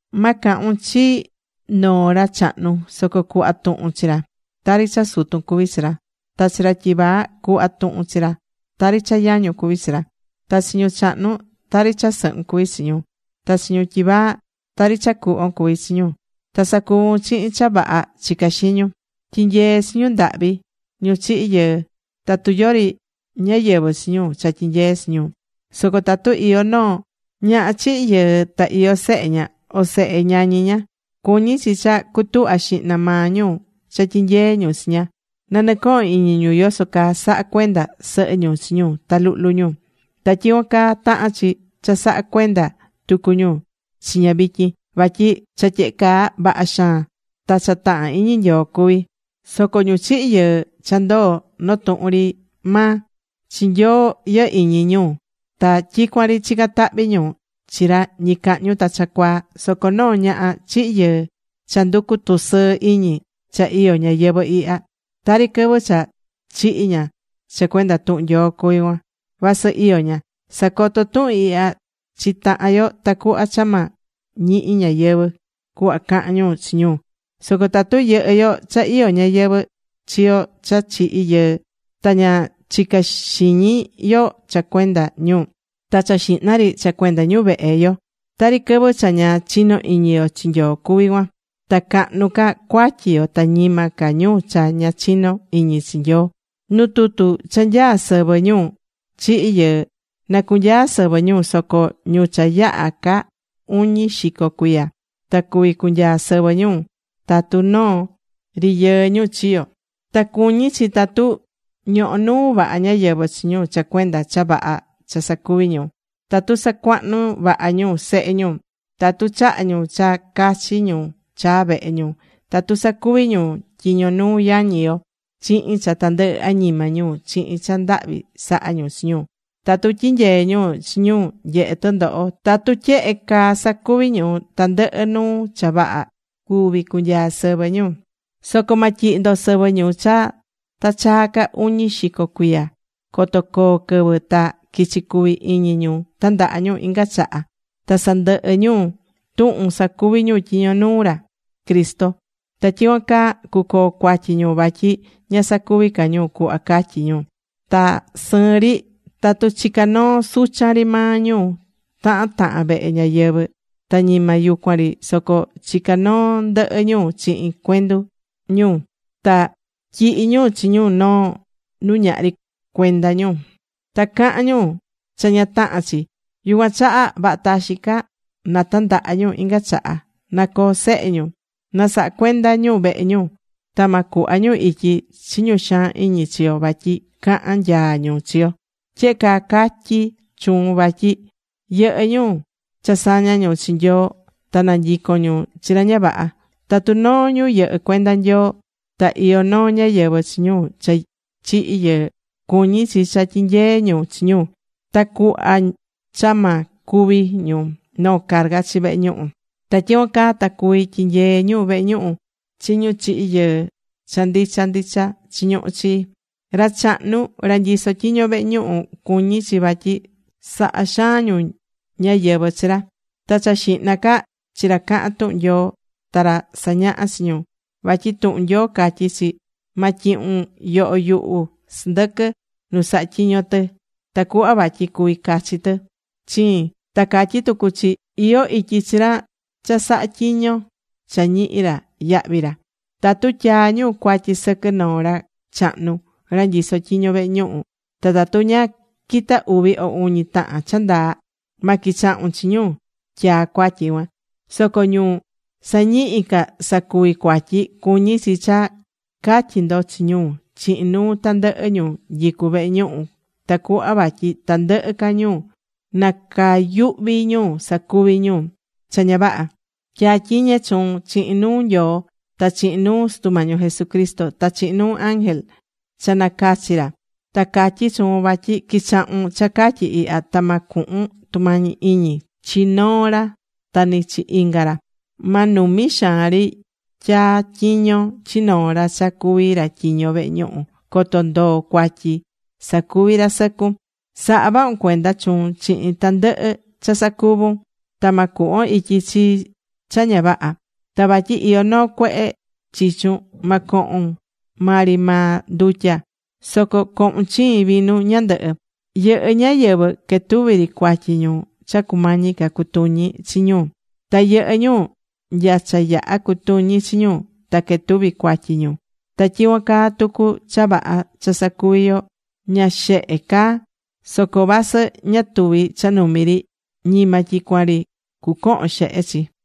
Ma cahun chi noo ra chahnu, soco cuhva tuhun chi ra tari cha sutun cuví chi ra. Ta chi ra tyivaa cu̱hva tuhun chi ra tari cha yañun cuví chi ra. Ta chi ñu chahnu tari cha sɨhun cuví chi ñu. Ta chi ñu tyivaa, tari cha cuhvon cuví chi ñu. Ta sa̱cuvun chihin cha vaha chicá xiñun. Tyi̱nyee chi ñu ndahvi ñu chihi̱ yɨɨ tatu yori ñáyɨvɨ chi ñu cha tyinyee chi ñu. Soco tatu iyó noo ñaha chihi̱ yɨɨ ta iyó sehe ña, o sehe ñañi ña, cuñí chi cha cutuhva xihna maa ñu cha tyinyee ñu chi ña. Na nɨcohon iñi ñu yoso caa saha̱ cuenda sɨhɨ ñu chi ñu ta luhlu ñu. Ta tyicuan caa tahán chi cha sa̱ha cuenda tucu ñu chi ña vityin. Vatyi cha tyehe caa vaha xaan, ta cha tahán iñi Nyoo cuví. Soco ñu chihi̱ yɨɨ cha ndoo̱ noo tuhun ri maa, chi Nyoo tyihí ñu iñi ñu ta tyicuan ri chicán tahvi ñu chi ra ñicahñu ta cha cuaa. Soco noo ñaha chihi̱ yɨɨ cha nducú tusɨɨ iñi cha iyó ñayɨvɨ̱ ihya, tari quɨvɨ cha chihi̱ ña cha cuenda tuhun Nyoo cuví cuan, vasɨ iyó ña. Sa̱coto tuhun ihya chi tahan yo tacuhva cha ma ñihi ñáyɨvɨ cuhva cahan ñu chi ñu. Soco tatu yɨhɨ́ yo cha iyó ñáyɨvɨ chi yo cha chihi̱ yɨɨ ta ña chicá xiñi yo cha cuenda ñu, ta cha xihna ri cha cuenda ñu vehe yo, tari quɨvɨ cha ña chinó iñi yo chi Nyoo cuvi cuan. Ta cahnu ca cuatyi yo ta ñima ca ñu cha ña chinó iñi chi Nyoo. Nu tutu cha nyaá sɨvɨ ñu chihi̱ yɨɨ, na cunyaa sɨvɨ ñu, soco ñu cha yaha̱ ca uñi xico cuiya. Ta cuví cunyaa sɨvɨ ñu tatu noo ri yɨɨ ñu chiyo̱. Ta cuñí chi tatu ñohó nuu vaha ñáyɨvɨ chi ñu cha cuenda cha vaha cha sacuví ñu: tatu sacuahnu̱ vaha ñu sehe ñu, tatu chaha̱ ñu cha cachi ñu chaa̱ vehe ñu, tatu sacuvi̱ ñu tyiño nuu yañi yo chihin cha tandɨhɨ añima ñu chihin cha ndahvi sahá ñu chi ñu, tatu tyinyee̱ ñu chi ñu nyehé tɨndoho, tatu tyehe caa sacuví ñu tandɨhɨ nuu cha vaha, cuví cunyaa sɨvɨ ñu. Soco ma tyihi ndo sɨvɨ ñu cha ta chaa ca uñi xico cuiya coto coo quɨvɨ ta quichi cuvi iñi ñu tandaha ñu inga chaha ta sandɨhɨ ñu tuhun sacuví ñu tyiño nuu ra Cristo. Ta tyicuan caa cucoo cuatyi ñu vatyi ña sacuví ca ñu cuhva catyi̱ ñu. Ta sɨɨn ri tatu chicá noo suchan ri maa ñu tahan tahan vehe ñáyɨvɨ. Ta ñima yucuan ri soco chicá noo ndɨhɨ ñu chihin cuendu ñu. Ta tyihí ñu chi ñu noo nu ñahri cuenda ñu. Ta cahán ñu cha ña tahán chi. Yucuan chaha vaha taxin ca na tandaha ñu inga chaha. Na coo sehe ñu. Na saha cuenda ñu vehe ñu. Ta ma cuhva ñu ityi chi ñu xaan iñi chi yo vatyi cahan nyaa ñu chi yo. Tyehe caa catyí chuun vatyi yɨhɨ́ ñu cha saña̱ ñu chi Nyoo ta na nyicon ñu chi ra ña vaha. Tatu noo ñu yɨhɨ́ cuenda Nyoo ta iyó noo ñáyɨvɨ chi ñu cha chihi̱ yɨɨ, cuñí chi cha tyinyee ñu chi ñu, tacuhva cha ma cuvi ñu noo carga chi vehe ñuhu. Ta tyicuan caa ta cuví tyinyee ñu vehe ñuhu chi ñu chihi̱ yɨɨ cha ndicha ndicha chiñuhú chi. Ra chahnu ra nyisó tyiño vehe ñuhu, cuñí chi vatyi saha xaan ñu ñáyɨvɨ chi ra. Ta cha xihna ca chi ra cahán tuhun Nyoo ta ra sañahá chi ñu. Vatyi tuhun Nyoo catyí chi: “Ma tyihun yoho yuhu sɨndɨquɨ nu saha tyiñó tɨ tacuhva vatyi cuvi cachi tɨ chiin.” Ta catyí tucu chi: “Iyó ityi chi ra cha sahá tyiño cha ñihí ra yahvi ra.” Tatu tyaá ñu cuatyi sɨquɨ noo ra chahnu ra nyisó tyiño vehe ñuhu, ta tatu ña quita uvi o uñi tahan cha ndaa, ma quichahun chi ñu tyaá cuatyi cuan. Soco ñu sañihi ca sacuvi cuatyi cuñí chi cha ca̱tyi ndo chi ñu chihin nuu tandɨhɨ ñu nyicú vehe ñuhu tacuhva vatyi tandɨhɨ ca ñu na cuyuhvi ñu sacuvi ñu cha ña vaha. Tya̱tyiñe chuun chihin nuu Nyoo ta chihin nuu Sutu Mañi yo Jesucristo, ta chihin nuu ángel cha nacachi̱ ra. Ta catyí chuun vatyi qui̱chahun cha catyí ihya ta ma cuhun tumañi iñi chi noo ra ta ni chi inga ra. Ma numi xaan ri tyaa tyiño chi noo ra cha cuvi ra tyiño vehe ñuhu. Coto ndoo cuatyi sacuví ra sɨcun. Sa̱ha vahun cuenda chuun chihin tandɨhɨ cha sacuvún ta ma cuhvon ityi chi cha ña vaha. Ta vatyi iyó noo cuehe chichun, ma cohun maa ri maa ndutya, soco co̱hun chiin vinu ñandɨhɨ. Yɨhɨ́ ñáyɨvɨ quetuví ri cuatyi ñu cha cumañi ca cutuñi chi ñu. Ta yɨhɨ ñu nya cha yaha cutuñi chi ñu ta cuquetuvi cuatyi ñu. Ta tyicuan caa tucu cha vaha cha sacuví yo, ña xehe caá. Soco vasɨ ña tuví cha numi ri, ñima tyicuan ri cucohon xehe chi.